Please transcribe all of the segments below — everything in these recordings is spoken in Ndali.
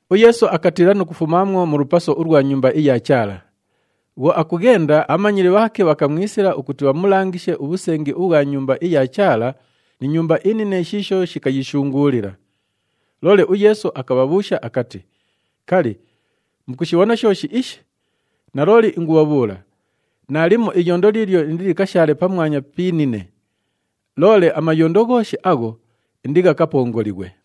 UYeesu akatiila nu kufumaamwo mu lupaso ulwa Nyumba iya Chaala. Bhwo akughenda, abhamanyili bhaake bhakamwisila ukuti bhamulangishe ubhusengi ubhwa Nyumba iya Chaala ni nyumba inine shiisho shikayishunguulila. Loole uYeesu akabhabhuusha akati, “Kali, mukushibhona shooshi ishi? Nalooli ingubhabhuula, naalimo iyondo liilyo indilikashaale pamwanya pi inine. Loole amayondo ghooshi agho, indighakapongolighwe!”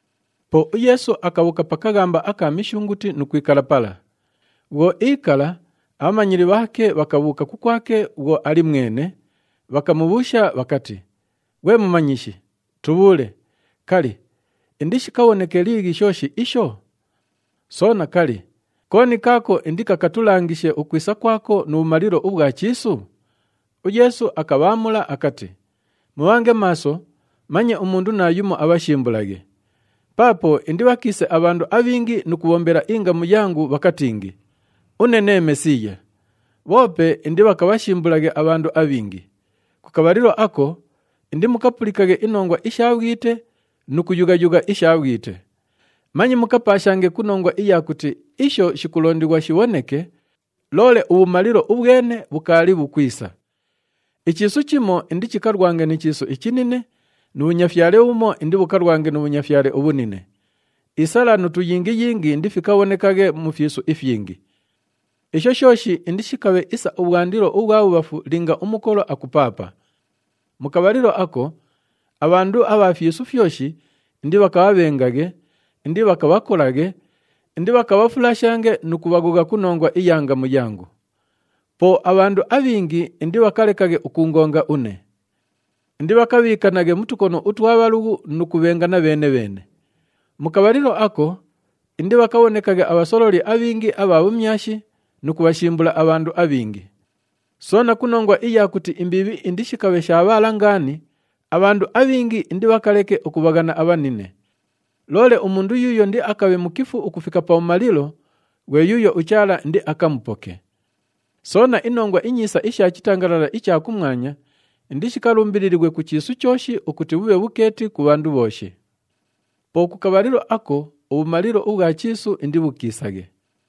Po uYeesu akabhuuka pa kaghamba aka Mishunguti nu kwikala pala. Bhwo iikala, abhamanyili bhaake bhakabhuuka kukwake bhwo ali mwene, bhakamubhuusha bhakati, “Ghwe Mumanyishi, tubhuule, kali, indishikabhoneke liighi shooshi isho? Soona, kali, kooni kaako indikakatulangishe ukwisa kwako nu bhumalilo ubhwa chiisu?” UYeesu akabhaamula akati, “Mubhange maaso, manye umundu naayumo abhashimbulaghe! Paapo indibhakiise abhandu abhingi nu kubhombela ingamu yangu, bhakatingi, ‘Une nee Mesiiya!’ Bhoope indibhakabhashimbulaghe abhandu abhingi. Ku kabhalilo ako indimukapulikaghe inongwa isha bhwite nu kuyugha-yugha isha bhwite. Manye mukapaashange ku nongwa iya kuti isho shikulondighwa shibhoneke, loole ubhumalilo ubhwene bhukaali bhukwisa. Ichiisu chimo indichikalwange ni chiisu ichinine nu bhunyafyale bhumo indibhukalwange nu bhunyafyale ubhunine. Isala nu tuyingiyingi indifikabhonekaghe mu fyisu ifyingi. Isho shooshi indishikabhe isa ubhwandilo ubhwa bhubhafu linga umukolo akupaapa. Mu kabhalilo ako, abhandu abha fyisu fyoshi indibhakabhabhenge, indibhakabhakolaghe, indibhakabhafulashange nu kubhaghogha ku nongwa iya ngamu yangu. Po abhandu abhingi indibhakalekaghe ukuungonga une. Indibhakabhiikanaghe mu tukono utwa bhalughu nu kubhengana bheene-bheene. Mu kabhalilo ako, indibhakabhonekaghe abhasololi abhingi abha bhumyashi nu kubhashimbula abhandu abhingi. Soona, ku nongwa iya kuti imbiibhi indishikabhe shaabhaala ngaani, abhandu abhingi indibhakaleke ukubhaghana abhanine. Loole umundu yuuyo indiakabhe mukifu ukufika pabhumalilo, ghwe yuuyo uChaala indiakamupoke. Soona, iNongwa iNyiisa isha chitangalala icha kumwanya indishikalumbililighwe ku chiisu chooshi ukuti bhubhe bhukeeti ku bhandu bhooshi. Po ku kabhalilo ako ubhumalilo ubhwa chiisu indibhukiisaghe.”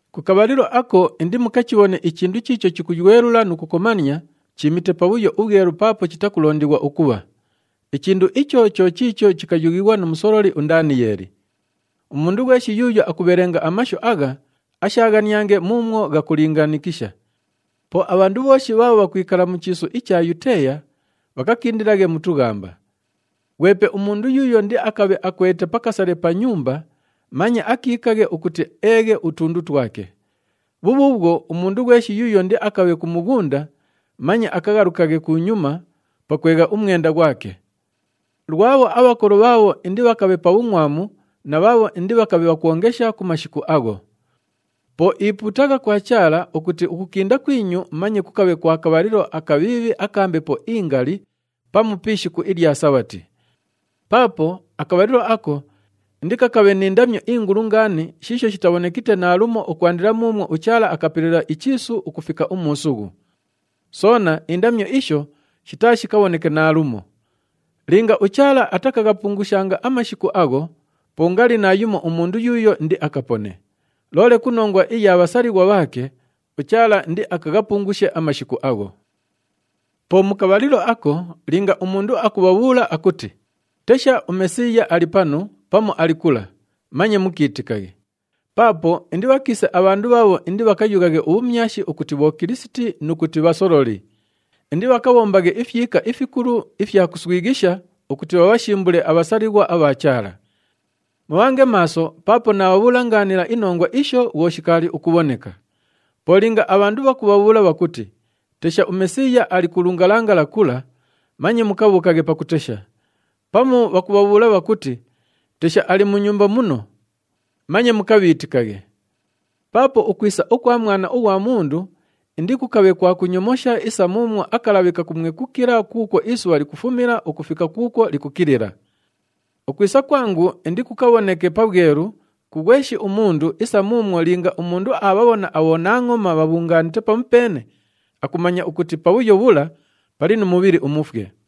“Ku kabhalilo ako indimukachibhone ‘ichindu chiicho chikuywelula nu kukomania,’ chiimite Pabhuyo uBhwelu paapo chitakulondighwa ukubha. Ichindu icho cho chiicho chikayughighwa nu musololi uNdaniyeeli. (Umundu ghweshi yuuyo akubhelenga amashu agha, ashaaghaniange muumwo ghakulingaanikisha.) Po abhandu bhooshi bhaabho bhakwikala mu chiisu icha Yuteeya, bhakakindilaghe mu tughamba. Ghwepe umundu yuuyo indiakabhe akwelite pa kasale pa nyumba, manye akiikaghe ukuti eeghe utundu twake. Bhubhuubhwo, umundu ghweshi yuuyo indiakabhe ku mughunda, manye akaghalukaghe kunyuma pakwegha umwenda ghwake. Lwabho abhakolo bhaabho indibhakabhe pa bhungʼwamu na bhaabho indibhakabhe bhakwongesha ku mashiku agho! Po ipuutagha kwa Chaala ukuti ukukinda kwinyu manye kukabhange ku kabhalilo akabhiibhi aka mbepo ingali pamu pi ishiku ilya Sabhati. Paapo akabhalilo ako, indikakabhe ni ndamyo ingulu ngaani shiisho shitabhonekite naalumo ukwandila muumwo uChaala akapelela ichiisu ukufika umuusughu. Soona, indamyo isho shitaashikabhoneke naalumo. Linga uChaala atakaghapungushanga amashiku agho, po ngali naayumo umundu yuuyo indiakapone. Loole ku nongwa iya bhasalighwa bhaake, uChaala indiakaghapungushe amashiku agho. “Po mu kabhalilo ako, linga umundu akubhabhuula akuti, ‘Tesha, uMesiiya ali panu,’ pamu, ‘Ali kula,’ manye mukiitikaghe. Paapo indibhakiise abhandu bhaabho indibhakayughaghe ubhumyashi ukuti bhokilisiti nu kuti bhasololi. Indibhakabhombaghe ifyika ifikulu ifya kuswighisha ukuti bhabhashimbule abhasalighwa abha Chaala. Mubhange maaso paapo naabhabhuula ngaanila inongwa isho bhwo shikaali ukubhoneka. Po linga abhandu bhakubhabhuula bhakuti, ‘Tesha, uMesiiya ali ku lungalangala kula!’ Manye mukabhuukaghe pakutesha. Pamu bhakubhabhuula bhakuti, ‘Tesha, ali mu nyumba muno!’ Manye mukabhiitikaghe. Paapo ukwisa ukwa Mwana ughwa Mundu indikukabhe kwa kunyomosha isa muumwo akalabhi kakumwekukila kuukwo isubha likufumila ukufika kuukwo likukilila. Ukwisa kwangu indikukabhoneke pabhwelu ku ghweshi umundu isa muumwo linga umundu aabhabhona abhonangʼoma bhabhungaanite pamupeene, akumanya ukuti pabhuyo bhula pali nu mubhili umufwe.”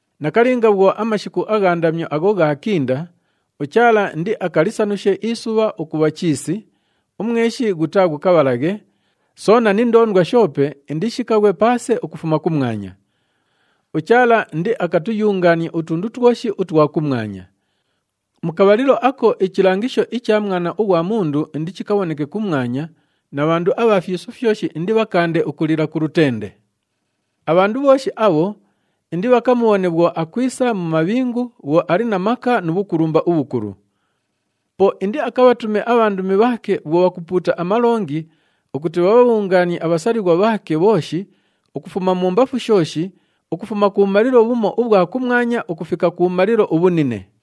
“Nakalinga bhwo amashiku agha ndamyo agho ghaakinda, ‘UChaala indiakalisanushe isubha ukubha chiisi, umweshi ghutaaghukabhalaghe, soona ni ndoondwa shoope indishikaghwe paase ukufuma kumwanya. UChaala indiakatuyungaanie utundu twoshi utwa kumwanya.’ “Mu kabhalilo ako ichilangisho icha Mwana ughwa Mundu indichikabhoneke kumwanya na bhandu abha fyisu fyoshi indibhakaande ukulila ku lutende. Abhandu bhooshi abho indibhakamubhone bhwo akwisa mu mabhingu bhwo ali na maka nu bhukulumba ubhukulu. Po indiakabhatume abhandumi bhaake bhwo bhakupuuta amalongi ukuti bhabhabhungaanie abhasalighwa bhaake bhooshi ukufuma mumbafu shooshi, ukufuma kubhumalilo bhumo ubhwa kumwanya ukufika kubhumalilo ubhunine.”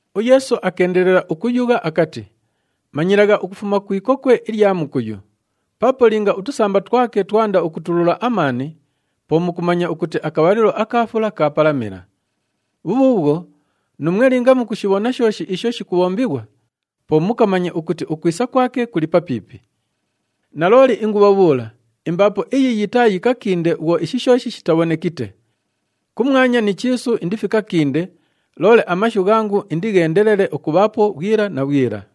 UYeesu akeendelela ukuyugha akati, “Manyilagha ukufuma ku ikokwe ilya mukuyu. Paapo linga utusamba twake twanda ukutulula amaani, po mukumanya ukuti akabhalilo aka fula kaapalamila. Bhubhuubhwo, nuumwe linga mukushibhona shooshi isho shikubhombighwa, po mukamanye ukuti ukwisa kwake kuli papiipi. Nalooli ingubhabhuula, imbaapo iyi yitaayikakinde bhwo ishi shooshi shitabhonekite. Kumwanya ni chiisu indifikakinde, loole amashu ghangu indigheendelele ukubhaapo bhwila na bhwila.”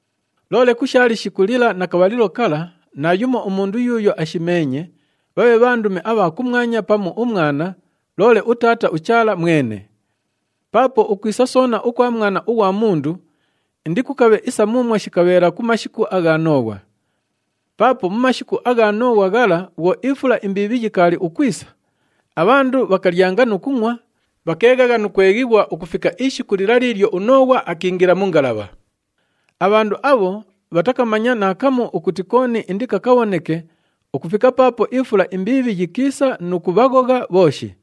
“Loole ku sha lishiku lila na kabhalilo kala, naayumo umundu yuuyo ashimeenye, bhabhe bhandumi abha kumwanya pamu uMwana, loole uTaata uChaala mwene. Paapo ukwisa soona ukwa Mwana ughwa Mundu indikukabhe isa muumwo shikabheela ku mashiku agha Nooghwa. Paapo mu mashiku agha Nooghwa ghala bhwo ifula imbiibhi yikaali ukwisa, abhandu bhakalyanga nu kungʼwa, bhakeeghagha nu kweghighwa ukufika ishiku lila liilyo uNooghwa akiingila mu ngalabha. Abhandu abho bhatakamanya naakamu ukuti kooni indikakabhoneke ukufika paapo ifula imbiibhi yikiisa nu kubhaghogha bhooshi.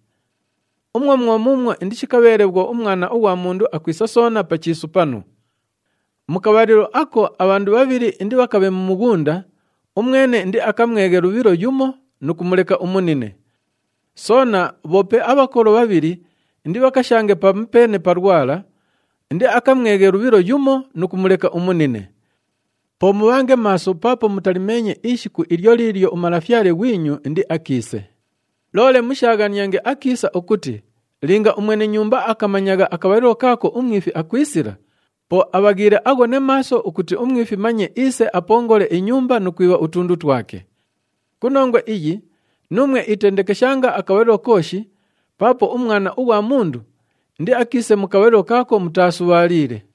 Umwo mwo muumwo indishikabheele bhwo uMwana ughwa Mundu akwisa soona pa chiisu panu. Mu kabhalilo ako abhandu bhabhili indibhakabhe mu mughunda, umwene indiakamweghe lubhilo yumo nu kumuleka umunine. Soona, bhoope abhakolo bhabhili indibhakashange pamupeene pa lwala, indiakamweghe lubhilo yumo nu kumuleka umunine. Po mubhange maaso paapo mutalimeenye ishiku ilyo liilyo uMalafyale ghwinyu indiakiise. Loole mushaaghaniange akiisa ukuti linga umwene nyumba akamanyagha akabhalilo kaako umwifi akwisila, po abhaghiile aghone maaso ukuti umwifi manye iise apongole inyumba nu kwibha utundu twake. Ku nongwa iyi nuumwe itendekeshanga akabhalilo kooshi paapo uMwana ughwa Mundu indiakiise mu kabhalilo kaako mutaasubhaaliile.”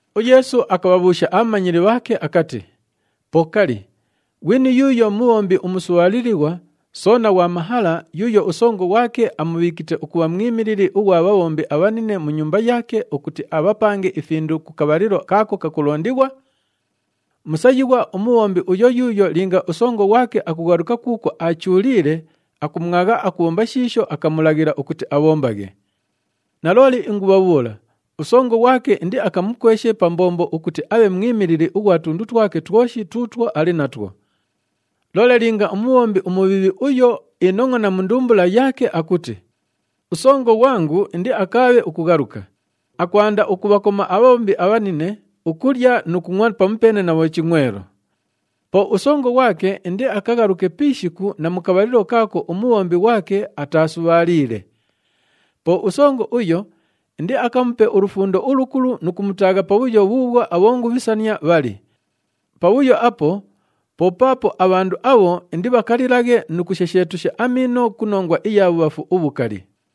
UYeesu akabhabhuusha abhamanyili bhaake akati, “Po kali, ghwini yuuyo mubhombi umusubhaalilighwa soona ghwa mahala yuuyo usongo ghwake amubhiikite ukubha mwimilili ughwa bhabhombi abhanine mu nyumba yaake ukuti abhapange ifindu ku kabhalilo kaako kakulondighwa? Musayighwa umubhombi uyo yuuyo linga usongo ghwake akughaluka kuukwo aachuuliile, akumwagha akubhomba shiisho akamulaghila ukuti abhombaghe. Nalooli ingubhabhuula, usongo ghwake indiakamukweshe pa mbombo ukuti abhe mwimilili ughwa tundu twake twoshi tuutwo ali natwo. Loole linga umubhombi umubhiibhi uyo, iinongʼona mu ndumbula yaake akuti, ‘Usongo ghwangu indiakaabhe ukughaluka,’ akwanda ukubhakoma abhabhombi abhanine, ukulya nu kungʼwa pamupeene na bhochingʼwelo. Po usongo ghwake indiakaghaluke pi ishiku na mu kabhalilo kaako umubhombi ghwake ataasubhaaliile. Po usongo uyo indiakamupe ulufundo ulukulu nu kumutaagha pabhuyo bhuubhwo abhongubhisania bhali. Pabhuyo apo po paapo abhandu abho indibhakalilaghe nu kushesheetusha amiino ku nongwa iya bhubhafu ubhukali.”